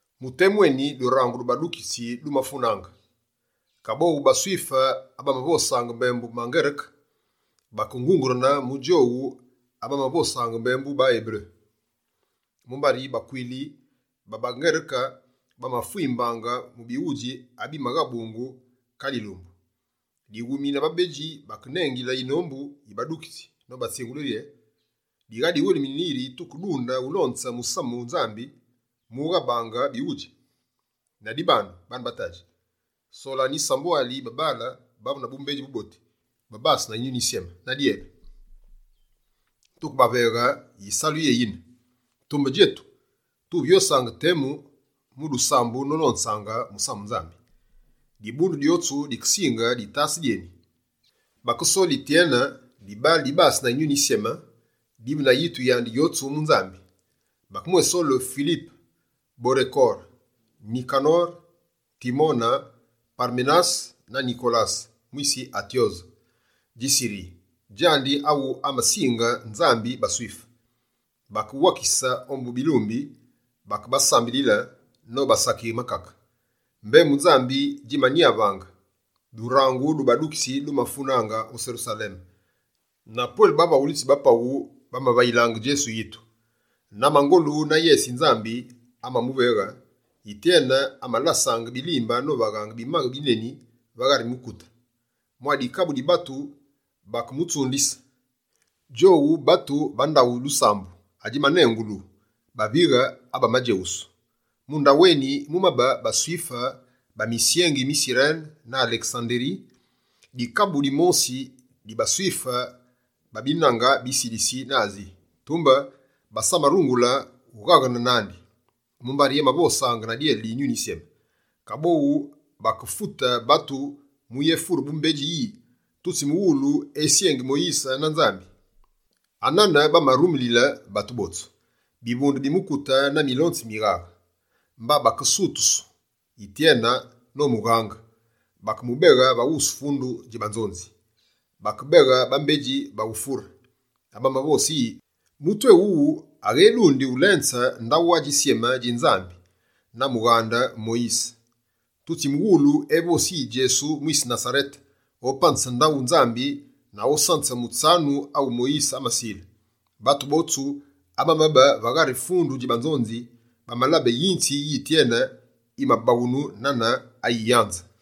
Mu temu eni, durangu du badukitsi dumafunaange. Kaboghu baSwife abamavosaange mbembu baNgereke, bakengugerene mu djowu abamavosaange mbembu baEberu. Mumbari bakwili ba baNgereke, bamafwimbungu mu bighudji abimaghabungu kale yilumbu. Dighumi na babedji bakenengile yinombu yi badukitsi nobatsingule riye: «Dighadiwelimine yi tukedunde ulonze musamu wu Nzambi mughabaange bighudji. Ladibandu, baane ba tadji, solanu yisambwali yi babaale bavu na bumbedji buboti, babase na Yinyuni Yisyeme na dyele. Tukebaveghe yisalu yeni yine. Tumbe djetu, tuvyosaange temu mu dusambu nolonze musamu Nzambi.» Dibundu dyotsu dikesinge ditase dyeni. Bakesole Yityene, dibaale dibase na Yinyuni Yisyeme, divu na yitu yandi yotsu mu Nzambi. Bakemwésole Filipe, Porekore, Nikanore, Timone, Paremenase na Nikolase, mwise Atyose dji Siri, djandi awu amasinge Nzambi baSwife. Bakebawakise ombu bilumbi, bakebasambilile nobasakighe makake. Mbembu Nzambi djimanyavaange. Durangu du badukitsi dumafunaange o Serusaleme, na pwele bavaghulitsi ba paghu bamavayilaange Djesu yitu. Na mangolu na yese yi Nzambi amamuveghe, Yityene amalasaange bilimbe novaghe bimaghe bineni va ghari mukute. Mwa dikabu di batu, bakemutsundise. Djowu batu ba ndaghu dusambu adjimanengulu «Bavighe abamadjeghusu». Mu ndaweni, mumabe baSwife ba misyengi mi Sirene na Alesanderi. Dikabu dimosi baSwife ba binange bi Silisi na Asi. Tumbe basamarungule ughaghene nandi, mumbari amavosaange na dyele di Yinyuni Yisyeme. Kaboghu bakefute batu muyéfure bumbedji yi: «Tutsimughulu esyengi Moyise na Nzambi.» Anane bamarulile batu botsu, bivunde bi mukute na milonzi mi mighaghe. Mba bakesutusu Yityene nomughange, bakemubeghe va wusu fundu dji banzonzi. Bakebeghe bambedji ba ufure, abamavose yi: «Mutu éwuwu aghedundi ulenze ndaghu adjisyeme dji Nzambi, na mughaghe Moyise! Tutsimughulu evosi yi Djesu mwise Nasarete, opanze ndaghu Nzambi na osanze mutsanu awu Moyise amasile.» Batu botsu abamabe va ghari fundu dji banzonzi, bamalabe yinzi yi Yityene yimabaghunu nane ayi yanze.